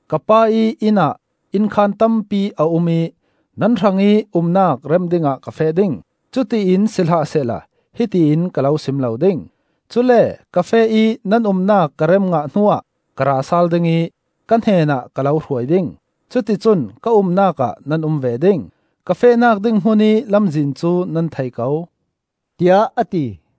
Ka Pa ih inn ah innkhaan tampi a um ih nan hrangih umnak rem dingah ka feh ding. Cutiin si hlah sehla hiti in ka lo sim lo ding. Cule ka feh ih nan umnak ka rem ngah hnuah ka ra sal ding ih ka hnenah ka lo hruai ding; cuticun ka umnak ah nan um ve ding. Ka fehnak ding hmunih lamzin cu nan thei ko,” tiah a ti.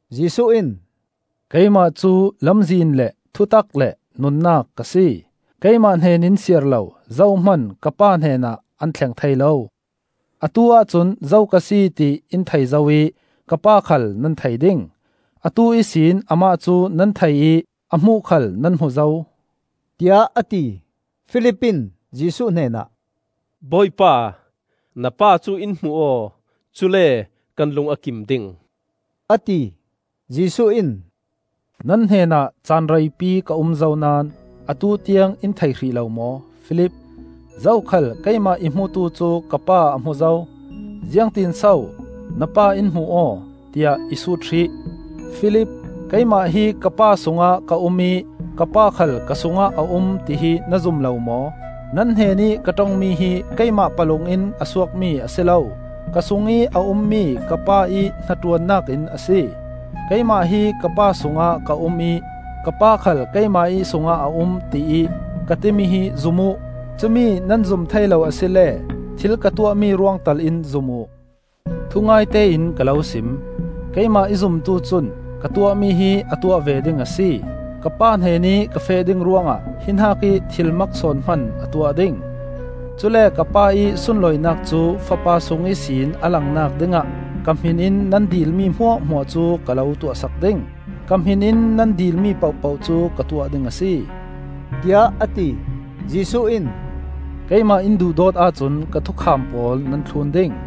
Jesuh in, “Keimah cu lamzin le thutak le nunnak ka si. Keimah hnenin siarlo zohman ka Pa hnenah an thleng thei lo. Atu-ah cun zo ka si, ti in thei zo ih ka Pa khal nan thei ding; atu ihsin amah cu nan thei ih a hmuh khal nan hmu zo,” tiah a ti. Filip in Jesuh hnenah, “Bawipa, na Pa cu in hmuh aw; cule kan lung a kim ding,” a ti. Jesuh in, “Nan hnenah caan reipi ka um zo naón atu tiang in thei hrih lo maw, Filip? Zokhal keimah i hmutu cu ka Pa a hmu zo. Ziangtin so ‘Na Pa in hmuh aw,’ tiah i sut hrih. Filip, keimah hi ka Pa sungah ka um ih ka Pa khal ka sungah a um, tihi na zum lo maw? Nan hnenih ka ṭongmi hi keimah palung in a suakmi a si lo; ka sungih a ummi ka Pa ih hnaṭuannak in a si. Keimah hi ka Pa sungah ka um ih ka Pa khal keimah ih sung ah a um, tiih ka timi hi zum uh. Cumi nan zum thei lo asile thil ka tuahmi ruang tal in zum uh. Thungaite in ka lo sim: Keimah i zumtu cun ka tuahmi hi a tuah ve ding; a si, ka Pa hnenih ka feh ding ruangah hi hnakih thil mak sawn hman a tuah ding. Cule ka Pa ih sunlawinak cu Fapa sung ihsin a langnak dingah ka hmin in nan dilmi hmuahhmuah cu ka lo tuahsak ding. Ka hmin in nan dilmi pohpoh cu ka tuah ding a si,” tiah a ti. Jesuh in, “Keimah in duhdawt ahcun ka thukham pawl nan thlun ding.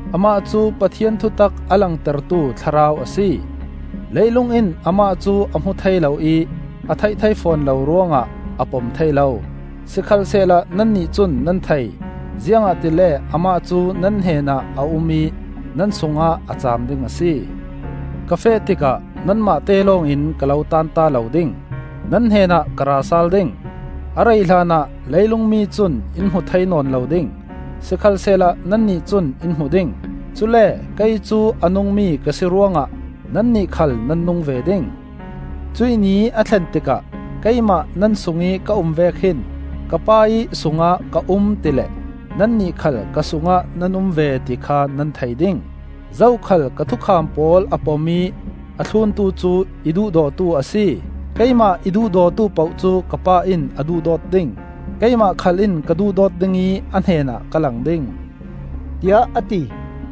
Amah cu Pathian thutak a langtertu Thlarau a si. Leilung in Amah cu a hmu thei lo ih a theih thei fawn lo ruangah a pom thei lo. Sikhalsehla nannih cun nan thei, ziangahtile amah cu nan hnenah a um ih nan sungah a caam ding a si. Ka feh tikah nanmahte lawngin ka lo tanta lo ding; nan hnenah ka ra sal ding. A rei hlanah leilung mi cun in hmu thei nawn lo ding, sikhalsehla nannih cun in hmu ding; cule kei cu a nungmi ka si ruang ah nannih khal nan nung ve ding. Cuih ni a thlen tikah keimah nan sungih ka um vek hin ka Pa ih sungah ka um ti le nannih khal ka sungah nan um ve ti kha nan thei ding. Zokhal ka thukham pawl a pom ih a thluntu cu i duhdawtu a si. Keimah i duhdawtu poh cu ka Pa in a duhdawt ding; keimah khal in ka duhdawt ding ih a hnenah ka lang ding,” tiah a ti.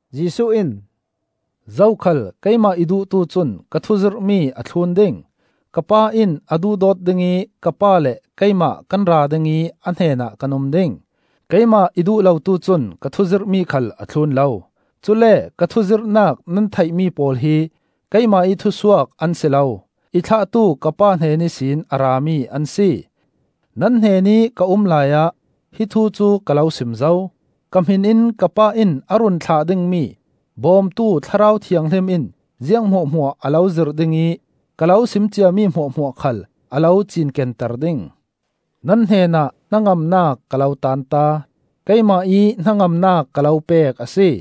Jesuh in, “Zokhal keimah i duhtu cun ka thu zirhmi a thlun ding. Ka Pa in a duhdawt ding ih ka Pa le keimah kan ra ding ih a hnenah kan um ding. Keimah i duh lotu cun ka thuzirhmi khal a thlun lo. Cule ka thuzirhnak nan theihmi pawl hi keimah ih thusuak an si lo, i thlahtu ka Pa hnen ihsin a rami an si. Nan hnenih ka um laiah hi thu cu ka lo sim zo. Ka hmin in ka Pa in a run thlah dingmi Bawmtu Thlarau Thianghlim in ziang hmuahhmuah a lo zirh ding ih ka lo sim ciami hmuahhmuah khal a lo cinkenter ding. Nan hnenah hnangamnak ka lo tanta. Keimah ih hnangamnak ka lo pek a si.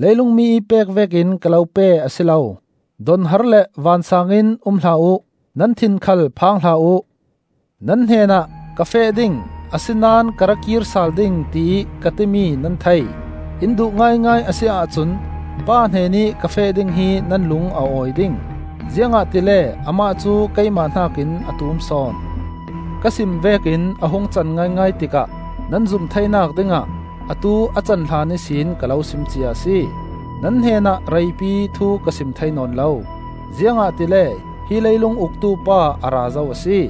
Leilung mi ih pek vekin ka lo pe a si lo. Donhar le vansaang in um hlah uh; nan thin khal phang hlah uh. Nan hnenah, ‘Ka feh ding, a si naón ka ra kir sal ding,’ tiih ka timi nan thei. In duh ngaingai a si ahcun Pa hnenih ka feh ding hi nan lung a awi ding; ziangahtile Amah cu keimah hnakin a tum sawn. Ka sim vekin a hung can ngaingai tikah nan zum theinak dingah atu a can hlan ihsin ka lo sim cia a si. Nan hnenah reipi thu ka sim thei nawn lo; ziangahtile hi leilung uktu pa a ra zo a si.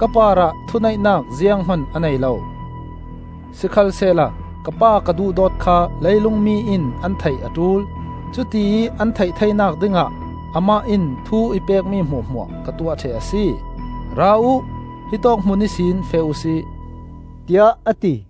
Ka parah thuneihnak zianghman a nei lo, sikhalsehla ka Pa ka duhdawt kha leilung mi in an theih a ṭul; cutiih an theih theinak dingah Amah in thu i pekmi hmuahhmuah ka tuah ṭheh a si. Ra uh, hitawk hmun ihsin feh uhsi,” tiah a ti.